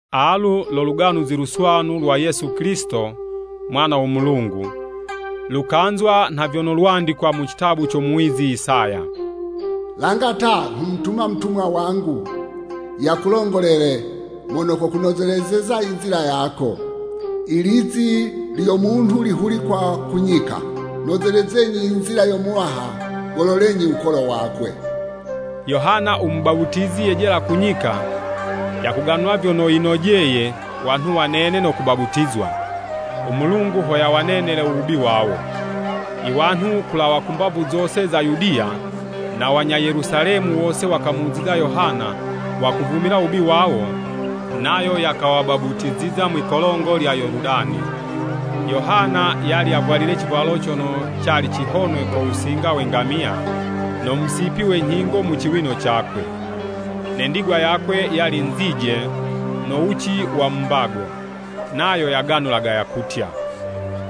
Alu lo Luganuzi Luswanu lwa Yesu Kilisito u mwana wo Mulungu. Lukanzwa nha vyono lwandikwa mu citabu co muwizi Isaya: “Langa ta, nghumutuma mutumwa wangu yakulongolele; Mono kokunozelezeza i nzila yako. I lizi lyo munhu lihulikwa ku nyika: Nozelezenyi i nzila yo Muwaha. Gololenyi wukolo wakwe.” Yohana u Mubaputizi yejela ku nyika, yakuganula vyono yinojeye wanhu wanene no kubaputizwa, u Mulungu ho yawanenele u wubi wawo. I wanhu kulawa mbavu zose za Yudiya, na wanya Yelusalemi wose wakamuziza Yohana, wakavumila wubi wawo, nayo yakawabaputiziza mwi'kolongo lya Yoludani. Yohana, yali yavwalile civwalo cono cali cihonwe ko wusinga we ngamiya, no musipi we nyhingo mu ciwino cakwe. Ne ndigwa yakwe, yali nzije no wuci wa mu mbago. Nayo yakaganula yakutya,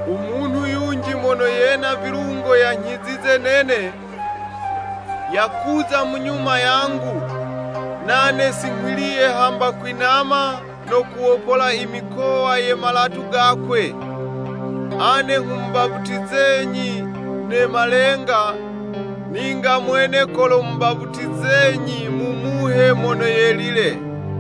“U Munhu yunji mono yena vilungo yanyhizize nene, yakuza mu nyuma yangu; nane si nghwiliye hamba kwinama, no kuwopola i mikowa ye malatu gakwe. Ane nghumubaputizenyi ne malenga, ninga mwene kolomubaputizenyi mu Muhe Mono Yelile.”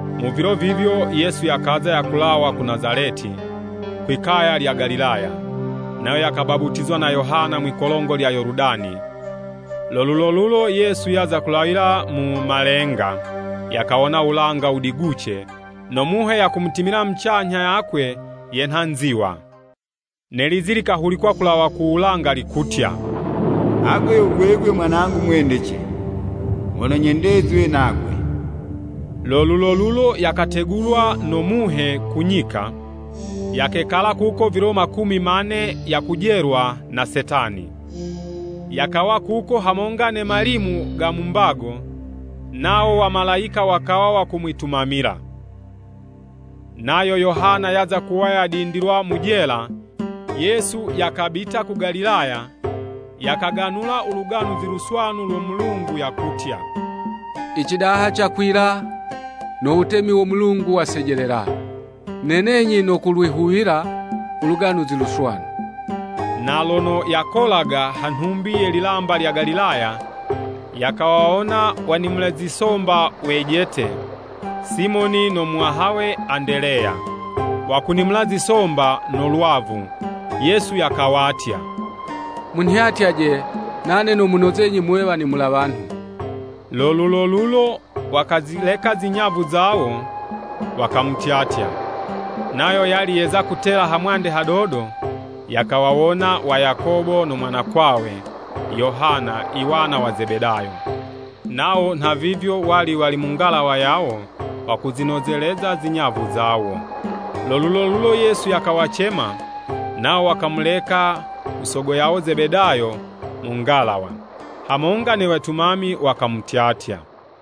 Mu vilo vivyo, Yesu yakaza yakulawa ku Nazaleti, kwi 'kaya lya Galilaya, nayo yakabaputizwa na Yohana mwi'kolongo lya Yoludani. Lo lulolulo Yesu yaza kulawila mu malenga, yakawona wulanga wudiguce, no Muhe yakumutimila mucanyha yakwe yenha nziwa. Ne lizi likahulikwa kulawa ku wulanga likutya, “Agwe yo gwegwe mwanangu mwendece; mono nyendezwe nagwe.” Lo lulolulo yakategulwa no Muhe ku nyika, yakekala kuko vilo makumi mane yakujelwa na Setani. Yakawa kuko hamonga ne malimu ga mu mbago, nawo Wamalayika wakawa wakumwitumamila. Nayo Yohana yaza kuwa yadindilwa mu jela, Yesu yakabita ku Galilaya, yakaganula u Luganuzi Luswanu lo Mulungu, yakutya, “Icidaha cakwila, no wutemi wo Mulungu wasejelela. Nenenyi no kulwihuwila u Luganuzi Luswanu!” Na lono yakolaga ha nhumbi ye lilamba lya Galilaya, yakawawona wanimula zisomba wejete, Simoni no muwahawe Andeleya, wakunimula zisomba no lwavu. Yesu yakawatya, “Munhyatyaje, nane nomunozenyi muwe wanimula wanhu.” Lo lulolulo wakazileka zinyavu zawo, wakamutyatya. Nayo yali yeza kutela hamwande hadodo, yakawawona wa Yakobo no mwanakwawe Yohana iwana wa Zebedayo. Nawo nha vivyo wali wali mu ngalawa yawo wakuzinozeleza zinyavu zawo. Lo lulolulo Yesu yakawacema, nawo wakamuleka u Sogo yawo Zebedayo mu ngalawa, hamonga ne wetumami, wakamutyatya.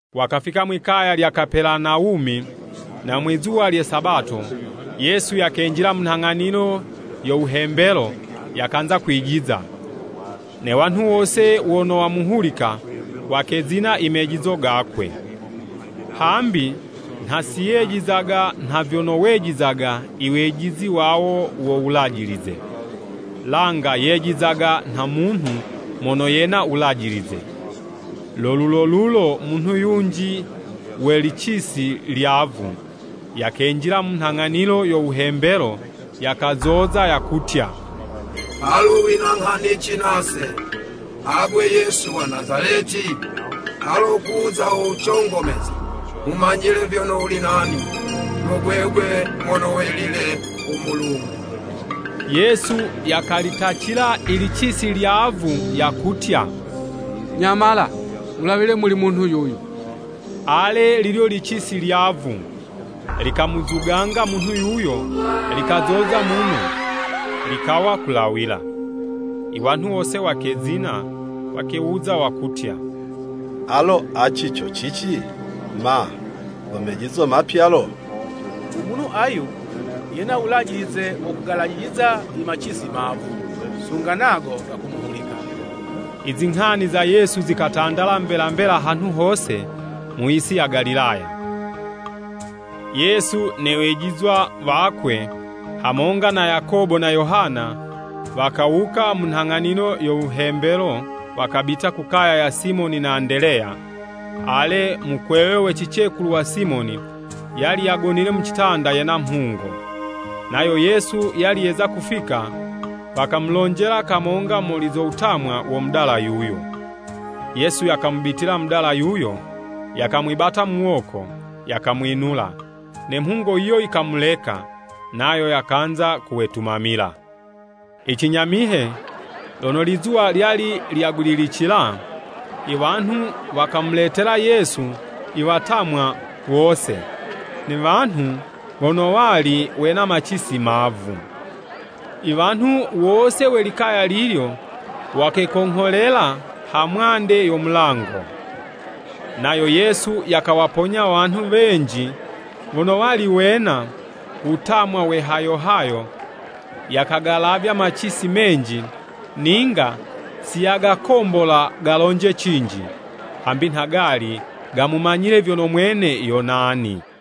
Wakafika mwikaya lya Kapelanawumi, na mwizuwa lye Sabato, Yesu yakenjila mu nhang'anilo yo wuhembelo, yakanza kwijiza. Ne wanhu wose wono wamuhulika, wakezina i mejizo gakwe, hambi nha siyejizaga nha vyono wejizaga iwejizi wawo wo Wulajilize, langa yejizaga nha munhu mono yena wulajilize. Lo lulolulo munhu yunji we licisi lyavu, yakenjila mu nhang'anilo yo wuhembelo, yakazoza, yakutya, “Alu wina nghanici nase, agwe Yesu wa Nazaleti? Alo kuza ho wucongomeze? Nghumanyile vyono wuli nani, yo gwegwe mono welile wo Mulungu!” Yesu yakalitacila ilicisi lyavu yakutya, “Nyamala! Wulawile muli munhu yuyu.” Ale, lilyo licisi lyavu, likamuzuganga munhu yuyo, likazoza muno, likawa kulawila. I wanhu wose wakezina, wakewuza wakutya, “Alo cici co cici? Ma, go mejizo mapya lo? U Munhu ayu, yena wulajilize wo kugalajiliza i macisi mavu, sunga nago gakumuhulika!” I zinghani za Yesu zikatandala mbela mbela hanhu hose, mu yisi ya Galilaya. Yesu ne wejizwa wakwe, hamonga na Yakobo na Yohana, wakawuka mu nghang'anilo yo wuhembelo, wakabita ku kaya ya Simoni na Andeleya. Ale, u mukwewe we cicekulu wa Simoni, yali yagonile mu citanda yena mhungo. Nayo Yesu yali yeza kufika, wakamulonjela kamonga muli zo wutamwa wo mudala yuyo. Yesu yakamubitila mudala yuyo, yakamwibata muwoko, yakamwinula. Ne mhungo yiyo yikamuleka, nayo yakanza kuwetumamila. Icinyamihe, lono lizuwa lyali lyagwililicila, i wanhu wakamuletela Yesu iwatamwa wose, ne wanhu wono wali wena macisi mavu. I wanhu wose we likaya lilyo wakekongholela ha mwande yo mulango. Nayo Yesu yakawaponya wanhu wenji wono wali wena wutamwa we hayo hayo, yakagalavya macisi menji, ninga siyagakombola galonje cinji, hambi nha gali gamumanyile vyono mwene yo nani.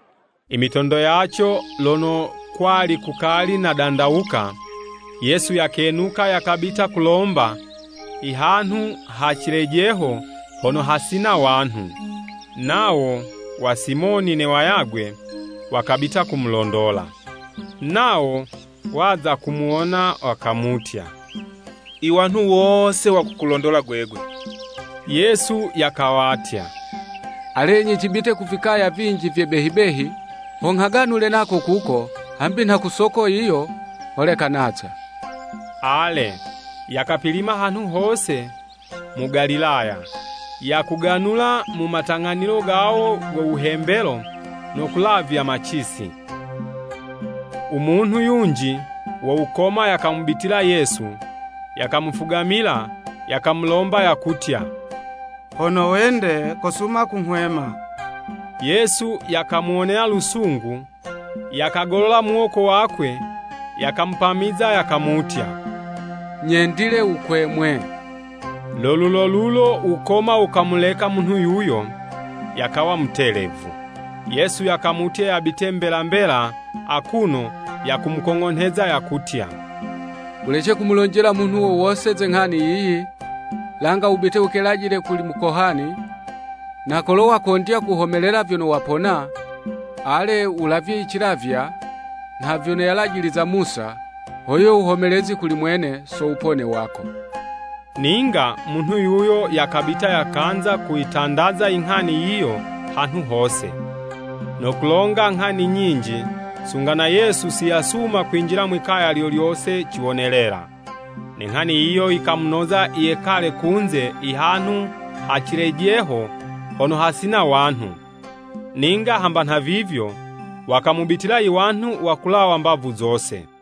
I mitondo yaco lono kwali kukali nadandawuka, Yesu yakenuka yakabita kulomba i hanhu ha cilejeho hono hasina wanhu. Nawo wa Simoni ne wayagwe wakabita kumulondola. Nawo waza kumuwona wakamutya, “I wanhu wose wakukulondola gwegwe.” Yesu yakawatya, “Alenyi cibite ku vikaya vinji vye behi behi, ho nghaganule nako kuko, hambi nha ku soko yiyo, holeka naza.” Ale, yakapilima hanhu hose mu Galilaya, yakuganula mu matang'anilo gawo go wuhembelo no kulavya macisi. U munhu yunji wo wukoma yakamubitila Yesu, yakamufugamila, yakamulomba yakutya, “Hono wende, kosuma kunghwema!” Yesu yakamuwonela lusungu, yakagolola muwoko wakwe, yakamupamiza yakamutya, “Nyendile, wukwemwe!” Lo lulolulo wukoma wukamuleka munhu yuyo, yakawa mutelevu. Yesu yakamutya yabite mbela mbela akuno yakumukong'onheza yakutya, “Wulece kumulonjela munhu wo wose ze nghani yiyi, langa wubite wukelajile kuli mukohani, na kolo wakondya kuhomelela vyono wapona, ale, wulavye i cilavywa nha vyono yalajiliza Musa, ho yiwe wuhomelezi kuli mwene so wupone wako.” Ninga munhu yuyo yakabita yakanza kuyitandaza inghani yiyo hanhu hose, no kulonga nghani nyinji, sunga na Yesu si yasuma kwinjila mwikaya lyo lyose ciwonelela. Ne nghani yiyo yikamunoza yekale kunze ihanhu ha cilejeho hono hasina wanhu. Ninga hamba nhavivyo, wakamubitila iwanhu wakulawa mbavu zose.